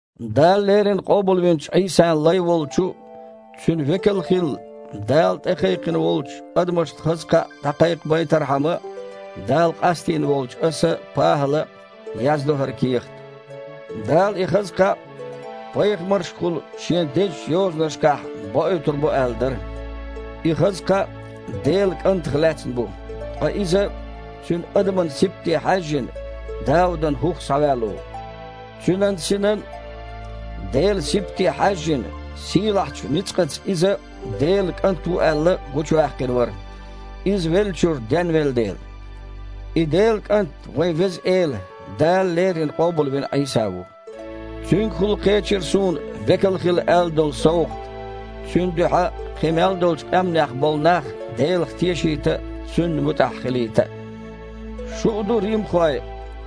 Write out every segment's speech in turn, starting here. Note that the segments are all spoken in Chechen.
Дала леррина къобалвинчу Іийсан лай волчу, Цуьнан векал хила Дала тІекхайкхина волчу, адамашна хаза кхаъ дІакхайкхабайтархьама Дала къастийна волчу аса, ПахІала, яздо хІара кехат. Дала и хаза кхаъ пайхамаршкахула Шен дезачу Йозанашкахь боуьйтур бу аьлла дара. И хаза кхаъ Делан КІантах лаьцна бу, ткъа Иза, Цуьнан адаман сибате хьаьжжина, Даудан хІух схьаваьлла ву. Цуьнан синан а, Делан а сибате хьаьжжина, сийлахьчу ницкъаца Иза, Делан КІант ву аьлла, гучуваьккхина вара, Иза веллачуьра денвелла дела. И Делан КІант – вайн Веза Эла, Дала леррина къобалвина Іийса ву. Цуьнгахула кхечира суна векал хила аьлла долу совгІат, Цуьнан дуьхьа кхин мел долчу къаьмнех болу нах Делах тешийта а, Цунна муьтІахь хилийта а. Шу а ду, римхой,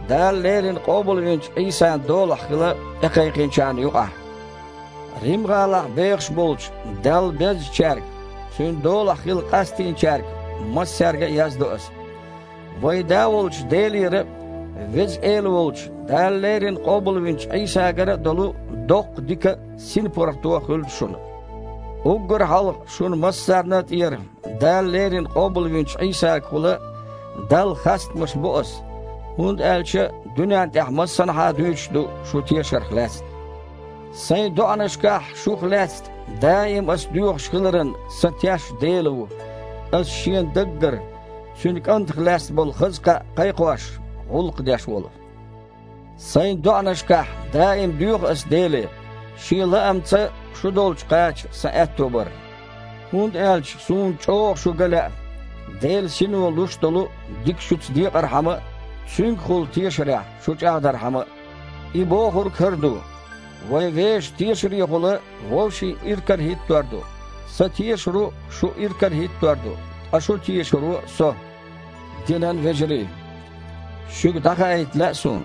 Дала леррина къобалвинчу Іийсан долахь хила тІекхайкхинчарна юкъахь. Рим-гІалахь бехаш болчу Далла безначаьрга, Цуьнан долахь хила къастийначаьрга массаьрга а яздо аса: Вайн Да волчу Делера а, Веза Эла волчу Дала леррина къобалвинчу Іийсагара а долу доккха дика а, синпаргІато а хуьлда шуна. Уггар а хьалха шуна массарна а тІера Дала леррина къобалвинчу Іийсагахула Далла хастамаш бо аса, хІунда аьлча дуьнен тІехь массанхьа а дуьйцуш ду шун тешарх лаьцна. Сайн доІанашкахь шух лаьцна даим ас доьхуш хиларан сан теш Дела ву, ас Шена даггара, Цуьнан КІантах лаьцна болу хаза кхаъ кхайкхош, гІуллакх деш волу. Сайн доІанашкахь даим доьху аса Деле Шен лаамца шу долчу кхача сан аьтто бар, хІунда аьлча суна чІогІа шу ган лаьа, Делан Сино луш долу дика шуьца декъархьама а, цуьнгахула тешарехь шу чІагІдархьама а. И бохург хІара ду: вай вешан тешарехула вовшийн иракарахІиттор ду: сан тешаро шу иракарахІиттор ду, ткъа шун тешаро – со. Динан вежарий! Шуьга дІахаийта лаьа суна: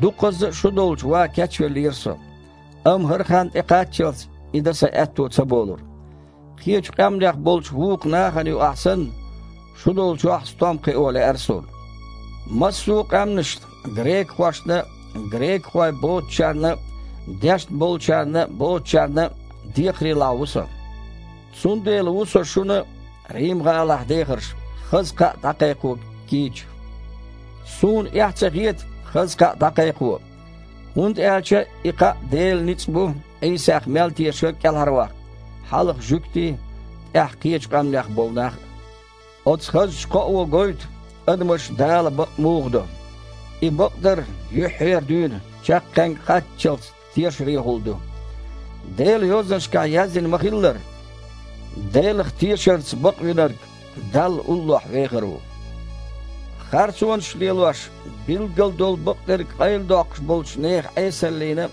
дукхазза а шу долчу ван кечвеллера со, амма, хІара хан тІекхаччалц, и дан сан аьтто ца болура. Кхечу къаьмнех болчу вукху нахана юкъахь санна, шу долчохь а стом кхио лаьара суна. Массо а къаьмнашна: грекахошна а, грекахой боцучарна а – дешна болчарна а, боцучарна а – декхарийлахь ву со. Цундела ву со шуна а, Рим-гІалахь дехарш, хаза кхаъ дІакхайкхо кийча. Суна эхь ца хета хаза кхаъ дІакхайкхо, хІунда аьлча и кхаъ Делан ницкъ бу Іийсах мел тешарг кІелхьарваккха – хьалха жуьгтий, тІаьхьа кхечу къаьмнех болу нах а. Оцу хазачу кхоо гойту, адамаш Дала бакъ муха до. И бакъдар, юьххьера дуьйна чаккхенга кхаччалц, тешарехула ду. Делан Йозанашкахь яздина ма-хиллара: «Делах тешарца бакъвинарг Далла уллохь вехар ву». Харцонаш а лелош, билггал долу бакъдерг къайладоккхуш болчу нехан Іесаллина а,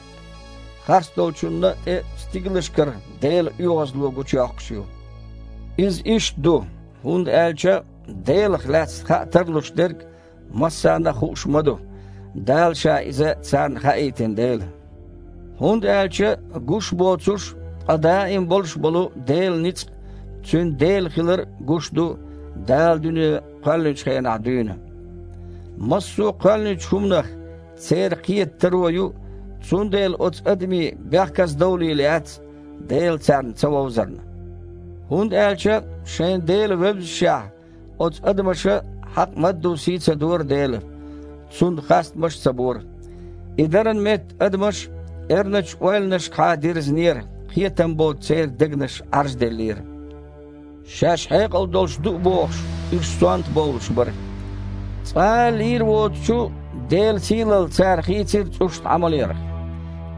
харцдолчунна а тІе стигалшкара Делан оьгІазло гучуйоккхуш ю. Иза иштта ду, хІунда аьлча Делах лаьцна хаа тарлуш дерг массарна а хууш ма ду, Дала Ша иза царна хаийтина дела. ХІунда аьлча, гуш а боцуш, ткъа даим болуш болу Делан ницкъ а, Цуьнан Дела хилар а гуш ду, Дала дуьне кхоьллинчу хенахь дуьйна. Массо а кхоьллинчу хІуманах церан кхета таро ю, цундела оцу адамийн бехказадовлийла яц Дела царна ца вовзарна. ХІунда аьлча шайна Дела вевззашехь, оцу адамаша хьакъ мадду сий а ца дора Делан, Цунна хастамаш а ца бора. И даран метта адамаш эрначу ойланашкахьа дирзинера, кхетам боцу церан дегнаш Іаржделлера. Шаьш хьекъал долуш ду а бохуш, уьш сонта бовлуш бара. Цкъа а лийр воцучу Делан сийлалла цара хийцира цІушна Іамалъярх.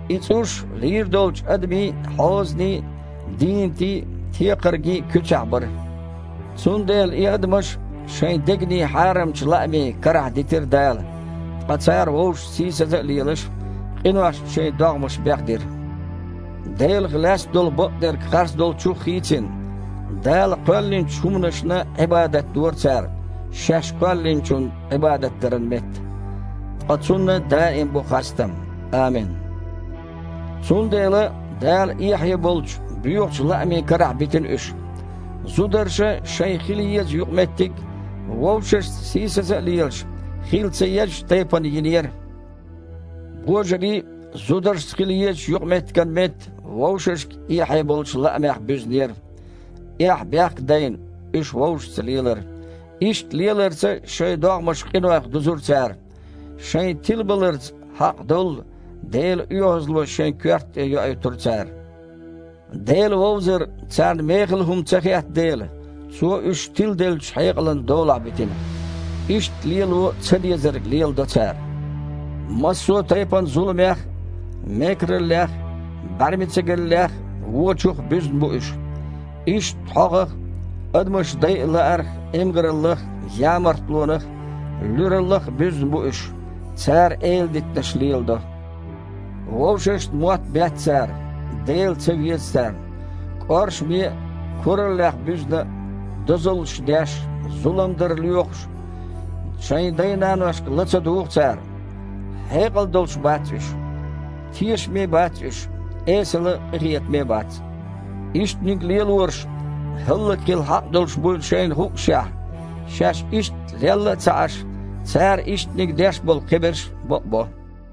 И цІуш лийр долчу адамийн а, хьозанийн а, дийнатийн а, текхаргийн а куьцехь бара. Цундела и адамаш шайн дегнийн хьарамчу лаамийн карахь дитира Дала, ткъа цара вовшашца сийсаза а лелаш, къиношца шайн догІмаш бехдира. Делах лаьцна долу бакъдерг харцдолчух а хийцина, Дала кхоьллинчу хІуманашна Іибадат дора цара, шаьш Кхоьллинчунна Іибадат даран метта. Ткъа Цунна даим бу хастам, амин! Цундела Дала эхье болчу, боьхачу лаамийн карахь битина уьш. Зударша шайн хила еза юкъаметтиг, вовшашца сийсаза а лелаш, хила ца еззачу тайпана йинера. Божарий а, зударшца хила езачу юкъаметтиган метта, вовшашка эхье болчу лаамех буьзнера. Эхь-бехк а дайна, уьш вовшашца лелара. Иштта леларца шайн догІмаш къинойх дузура цара. Шайн тилабаларца хьакъ доллу Делан оьгІазло шайн коьрта тІе йоуьйтура цара. Дела вовзар царна мехала хІума ца хетта дела, Цо уьш тиладеллачу хьекъалан долахь битина. Иштта лело цадезарг леладо цара. Массо а тайпана зуламех а, мекараллех а, бІаьрмецигаллех а, вочух а буьзна бу уьш. Иштта хьогІах а, адамаш дайа лаарх а, эмгараллах а, ямартлонах а, луьраллах а буьзна бу уьш. Цара эладитанаш леладо. Вовшашна мотт бетта цара. Дела ца веза царна. КІоршаме а, кураллех буьзна а, дозаллаш деш а, зулам дар лоьхуш а, шайн дай-наношка ла ца дугІу цара. Хьекъал долуш бац уьш. Тешаме а бац уьш, эсала а, къинхетаме а бац. Ишттаниг лелораш хІаллакьхила хьакъ долуш буйла шайна хуъушехь, шаьш иштта лелла а ца Іаш, цара ишттаниг деш болу кхиберш а бакъбо.